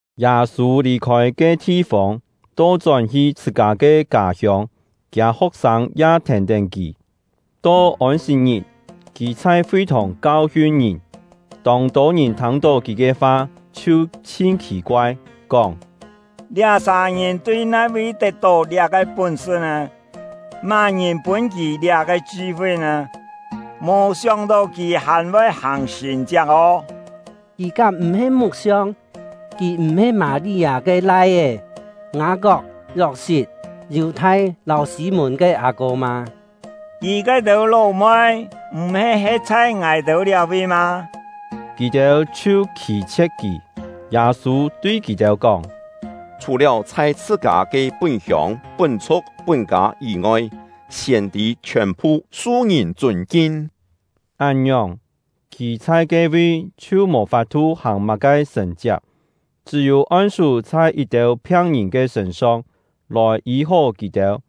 Yâ-sû lì-khôi ke thi-fông, to-chón-hi chhṳ-kâ ke kâ-hiông; kiâ ho̍k-sâng ya thèn-tén kì. To Ôn-sit-ngit, kì chhai fi-thòng kau-hiun ngìn. Tông-tô ngìn thâng-tó kì ke fa chhiu chhin khì-koai, kóng: “Liá-sà ngìn tui nai-vi tet-tó liá-ke pún-sṳ nè? Má-ngìn pûn kì liá-ke chṳ-fi nè? Mò sióng-tó kì hàn-voi hàng sṳ̀n-chiak ô! Kì kám m̀-he muk-siong? Kì m̀-he Mâ-li-â ke lai-é, Ngâ-kok, Yok-sit, Yù-thai lâu Sî-mùn ke â-kô mâ? Kì ke-têu ló-moi m̀-he he̍t chhai ngài-têu liá-vi mâ?” Kì-têu chhiu khî-chhie̍t kì. Yâ-sû tui kì-têu kóng: “Chhù-liáu chhai chhṳ-kâ ke pún-hiông, pún-chhu̍k, pún-kâ yî-ngoi, siên-tî chhiòn-phu su ngìn chûn-kin.” Án-ngiòng, kì chhai ke-vi chhiu mò fap-thu hàng má-ke sṳ̀n-chiak, chṳ́-yû on-sú chhai yit-têu phiang-ngìn ke sṳ̂n-song, lòi yî-hó kì-têu.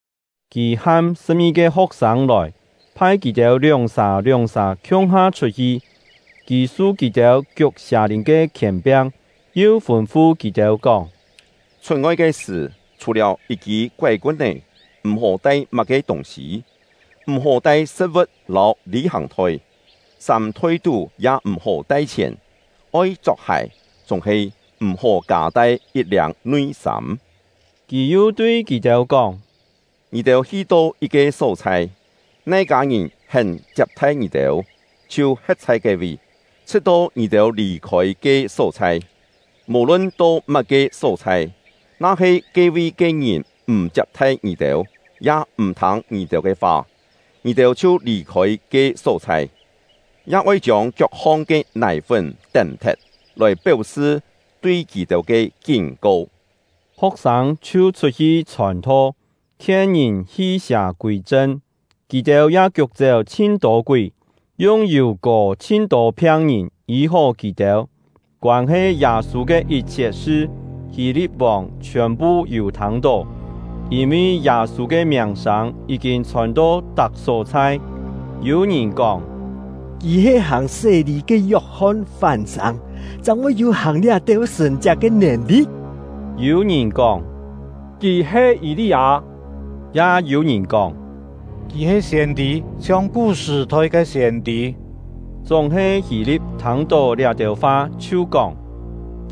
Kì ham sṳ̍p-ngi-ke ho̍k-sâng lòi, phai kì-têu lióng-sà lióng-sà khiung-ha chhut-hi. Kì su kì-têu kiuk sià-lìn ke khièn-piang, yu fûn-fu kì-têu kóng: “Chhut-ngoi ke sṳ̀, chhù-liáu yit-kî koái-kun-é, m̀-hó tai má-ke tûng-sî; m̀-hó tai sṳ̍t-vu̍t lâu lî-hàng-thoi, sâm-thoi-tú ya m̀-hó tai chhièn; oi chok-hài, chúng-he m̀-hó kâ-tai yit-liâng nui-sâm.” Kì yu tui kì-têu kóng: “Ngì-têu hi-to yit-ke só-chhai, nai kâ-ngìn hén chiap-thai ngì-têu, chhiu he̍t chhai ke-vi, chhṳ̍t-to ngì-têu lì-khôi ke só-chhai. Mò-lun to má-ke só-chhai, na-he ke-vi ke ngìn m̀ chiap-thai ngì-têu, ya m̀-thâng ngì-têu ke fa, ngì-têu chhiu lì-khôi ke só-chhai, ya oi chiông kiok-hong ke nài-fún tém-thet, lòi péu-sṳ tui kì-têu ke kín-ko.” Ho̍k-sâng chhiu chhut-hi chhòn-tho, khien ngìn hi-sià kûi-chṳn. Kì-têu ya kiuk-chéu chhin-tô kúi, yung yù kò chhin-tô phiang-ngìn, yî-hó kì-têu. Koân-he Yâ-sû ke yit-chhiet sṳ, Hî-li̍t-vòng chhiòn-phu yû thâng-tó, yîn-vi Yâ-sû ke miàng-sâng yí-kîn chhòn-to tak só-chhai. Yû ngìn kóng: “Kì he hàng sé-lî ke Yok-hon fán-sâng, chang voi yû hàng liá-têu sṳ̀n-chiak ke nèn-li̍t.” Yû ngìn kóng: “Kì he Yî-li-â.” Ya yû ngìn kóng: “Kì he siên-tî, chhiong kú-sṳ̀-thoi ke siên-tî.” Chúng-he Hî-li̍t thâng-tó liá-têu fa, chhiu kóng: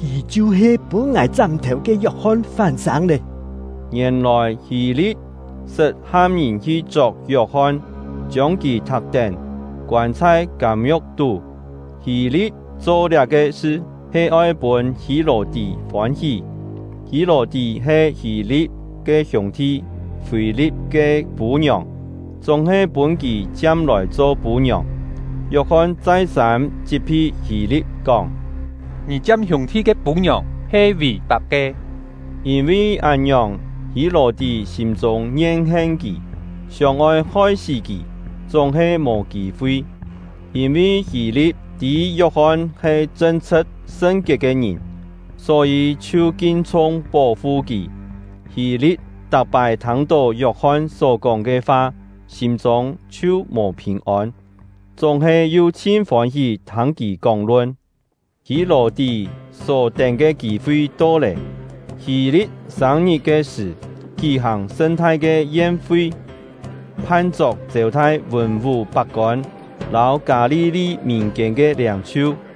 “Kì chhiu-he pûn ngài chám-thèu ke Yok-hon fán-sâng lé!” Ngièn-lòi, Hî-li̍t sṳt ham ngìn hi chok Yok-hon, chiông kì thak-tén, koân chhai kâm-ngiu̍k tú. Hî-li̍t cho liá-ke sṳ he oi pûn Hî-lò-tí fôn-hí; Hî-lò-tí he Hî-li̍t ke hiûng-thi Fî-li̍t ke pû-ngiòng, chúng-he pûn kì chiam-lòi cho pû-ngiòng. Yok-hon chai-sâm chit-phi Hî-li̍t kóng: “Ngì chiam hiûng-thi ke pû-ngiòng he vì-fap ke!” Yîn-vi án-ngiòng, Hî-lò-tí sîm-chûng yen-hen kì, sióng-oi hoi-sí kì, chúng-he mò kî-fi; yîn-vi Hî-li̍t tî Yok-hon he chṳn-chhṳ̍t sṳn-kiet ke ngìn, só-yî chhiu kin-chhung pó-fu kì. Hî-li̍t tak-pái thâng-tó Yok-hon só-kóng ke fa, sîm-chûng chhiu mò phìn-ôn, chúng-he yu chhin fôn-hí thâng kì kóng-lun. Hî-lò-tí só tén ke kî-fi to lé. Hî-li̍t sâng-ngit ke sṳ̀, kí-hàng sṳn-thai ke yen-fi, phan-chok chêu-thai vùn-vú pak-kôn lâu Kâ-li-li mìn-kiên ke liâng-chhiu.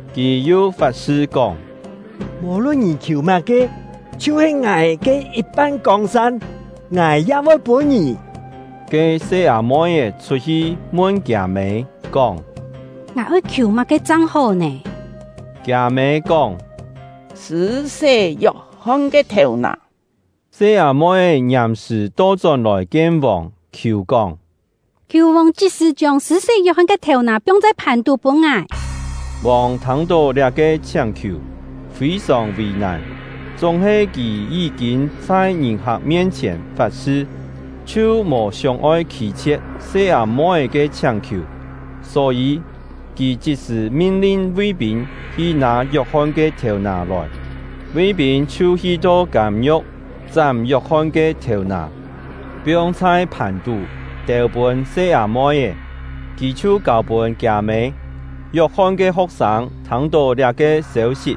Kì yu fat-sṳ kóng: “Mò-lun ngì khiù má-ke, chhiu-he ngài ke yit-pan kông-sân, ngài ya voi pûn ngì!” Ke se-â-moi-é chhut-hi mun kiâ-mê, kóng: “Ngài oi khiù má-ke chang hó nè?” Kiâ-mê kóng: “Sṳ̂-sé Yok-hon ke thèu-nà.” Se-â-moi-é ngiàm-sṳ̀ to-chón-lòi kien vòng, khiù kóng: “Khiù vòng chit-sṳ̀ chiông Sṳ̂-sé Yok-hon ke thèu-nà piong chhai phàn-tú pûn ngài!” Vòng thâng-tó liá-ke chhiáng-khiù, fî-sòng vì-nàn; chúng-he kì yí-kîn chhai ngìn-hak mien-chhièn fat-sṳ, chhiu mò sióng-oi khî-chhie̍t se-â-moi-é ke chhiáng-khiù. Só-yî, kì chit-sṳ̀ min-lin ví-pîn hi nâ Yok-hon ke thèu-nà lòi. Ví-pîn chhiu hi-to kâm-ngiu̍k, chám Yok-hon ke thèu-nà, piong chhai phàn-tú, têu-pûn se-â-moi-é; kì chhiu kâu-pûn kiâ-mê. Yok-hon ke ho̍k-sâng thâng-tó liá-ke sêu-sit,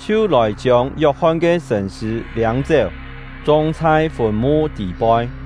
chhiu lòi chiông Yok-hon ke sṳ̂n-sṳ̂ liâng-chéu, chong chhai fùn-mu tî-poi.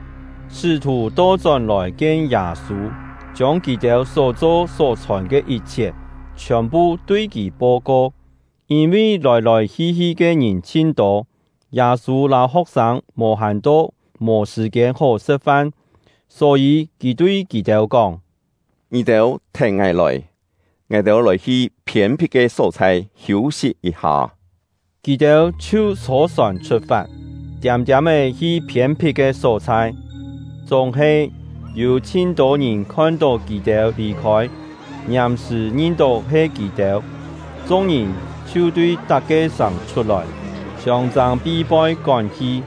Sṳ́-thù to-chón-lòi kien Yâ-sû, chiông kì-têu só-cho só-chhòn ke yit-chhiet, chhiòn-phu tui kì po-ko. Yîn-vi lòi-lòi hi-hi ke ngìn chhin tô, Yâ-sû lâu ho̍k-sâng mò-hàn to mò sṳ̀-kiên hó sṳ̍t-fan, só-yî kì tui kì-têu kóng: “Ngì-têu thèn ngài lòi, ngài-têu lòi-hi phiên-phit ke só-chhai hiû-sit yit-ha.” Kì-têu chhiu chhô-sòn chhut-fat, tiâm-tiâm-é hi phiên-phit ke só-chhai. Chúng-he, yû chhin-tô ngìn khon-tó kì-têu lì-khôi, ngiàm-sṳ̀ ngin-tó he kì-têu. Chung-ngìn chhiu tui tak-ke sàng chhut-lòi, siông-châng pi-poi kón hi,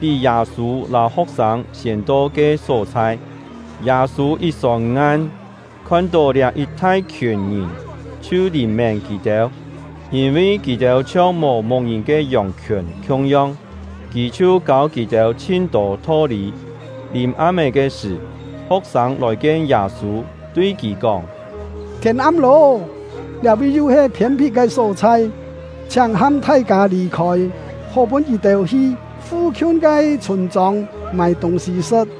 pí Yâ-sû lâu ho̍k-sâng siên to ke só-chhai. Yâ-sû yit sông-ngan, khon-tó liá yit thai-khiùn ngìn, chhiu lìn-mén kì-têu, yîn-vi kì-têu chhiong mò mu̍k-ngìn ke yòng-khiùn khiung-yong; kì chhiu kâu kì-têu chhin-tô tho-lî. Lìm-am-é ke sṳ̀, ho̍k-sâng lòi-kien Yâ-sû, tui kì kóng: “Thiên am lô, liá-vi yu he phiên-phit ke só-chhai, chhiáng ham thai-kâ lì-khôi, hó pûn kì-têu hi fu-khiun ke chhûn-chông mâi tûng-sî sṳ̍t.”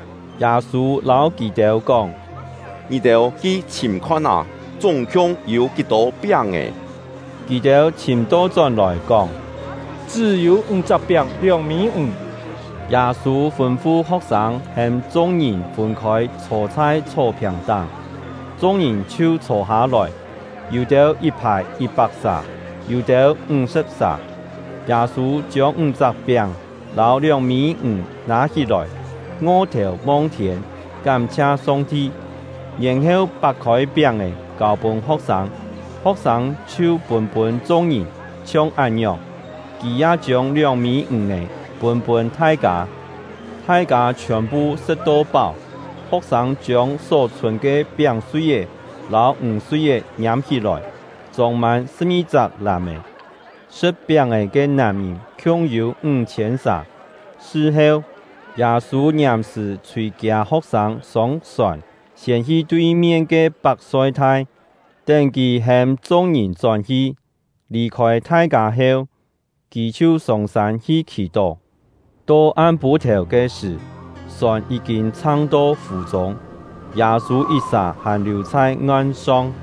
Yâ-sû lâu kì-têu kóng: “Ngì-têu hi chhìm-khon-ná, chúng-khiung yû kí-tô piáng-è?” Kì-têu chhìm to-chón-lòi kóng: “Chṳ́-yû ńg-chak piáng, lióng-mî ǹg.” Yâ-sû fûn-fu ho̍k-sâng hêm chung-ngìn fûn-khôi chhô chhai chhó-phiàng-táng. Chung-ngìn chhiu chhô-hâ-lòi, yû-têu yit-phài yit-pak sà, yû-têu ńg-sṳ̍p sà. Yâ-sû chiông ńg-chak piáng lâu lióng-mî ǹg nâ-hí-lòi, ngo-thèu mong-thiên, kám-chhia Song-ti, yèn-heu pak-khôi piáng-è, kâu-pûn ho̍k-sâng; ho̍k-sâng chhiu pûn-pûn chung-ngìn. Chhiong án-ngiòng, kì ya chiông lióng-mî ǹg-è pûn-pûn thai-kâ. Thai-kâ chhiòn-phu sṳ̍t-to páu; ho̍k-sâng chiông só chhûn ke piáng-sui-é lâu ǹg-sui-é ngiâm-hí-lòi, chông-mân sṳ̍p-ngi-chak làm-è. Sṳ̍t piáng-è ke nàm-ngìn khiung-yû ńg-chhiên sà. Sṳ-heu, Yâ-sû ngiàm-sṳ̀ chhûi kiâ ho̍k-sâng sông-sòn, siên hi tui-mien ke Pak-soi-thai, tén kì hêm chung-ngìn chón-hi. Lì-khôi thai-kâ heu, kì chhiu sông-sân hi khì-tó. To am-pû-thèu ke sṳ̀, sòn yí-kîn chhang-to fù-chûng, Yâ-sû yit-sà hàn liù chhai ngan-song.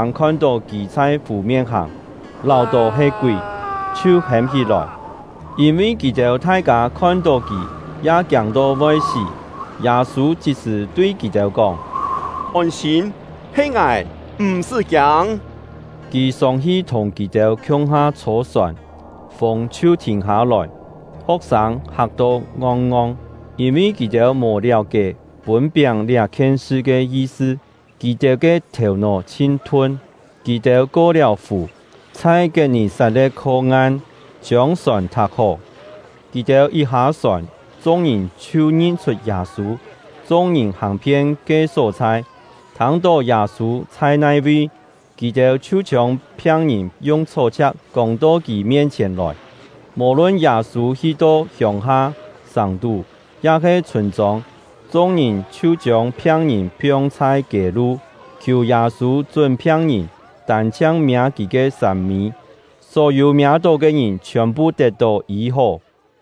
Ho̍k-sâng khon-tó kì chhai fù-mien hàng, láu-tó he kúi, chhiu hêm hí-lòi; yîn-vi kì-têu thai-kâ khon-tó kì, ya kiâng-to voi sí. Yâ-sû chit-sṳ̀ tui kì-têu kóng: “Ôn-sîm, he ngài, m̀-sṳ́ kiâng!” Kì sông-hi thùng kì-têu khiung-ha chhô-sòn, fûng chhiu thìn hâ-lòi. Ho̍k-sâng hak-to ngong-ngong, yîn-vi kì-têu mò liáu-kié pûn piáng liá-khien sṳ ke yi-sṳ; kì-têu ke thèu-nó chhin thun. Kì-têu ko-liáu fù, chhai Kiet-nì-sat-le̍t kho ngan, chiông sòn thak-hó. Kì-têu yit hâ-sòn, chung-ngìn chhiu ngin-chhut Yâ-sû. Chung-ngìn hàng-phien ke só-chhai, thâng-tó Yâ-sû chhai nai-vi, kì-têu chhiu chiông phiang-ngìn yung chhó-chhia̍k kông-to kì mien-chhièn lòi. Mò-lun Yâ-sû hi-to hiông-ha, sàng-tú, ya-he chhûn-chông, chung-ngìn chhiu chiông phiang-ngìn piong chhai kiê-lu, khiù Yâ-sû chún phiang-ngìn tân-chhiang miâ kì ke sâm-mî; só-yû miâ-tó ke ngìn chhiòn-phu tet-tó yî-hó.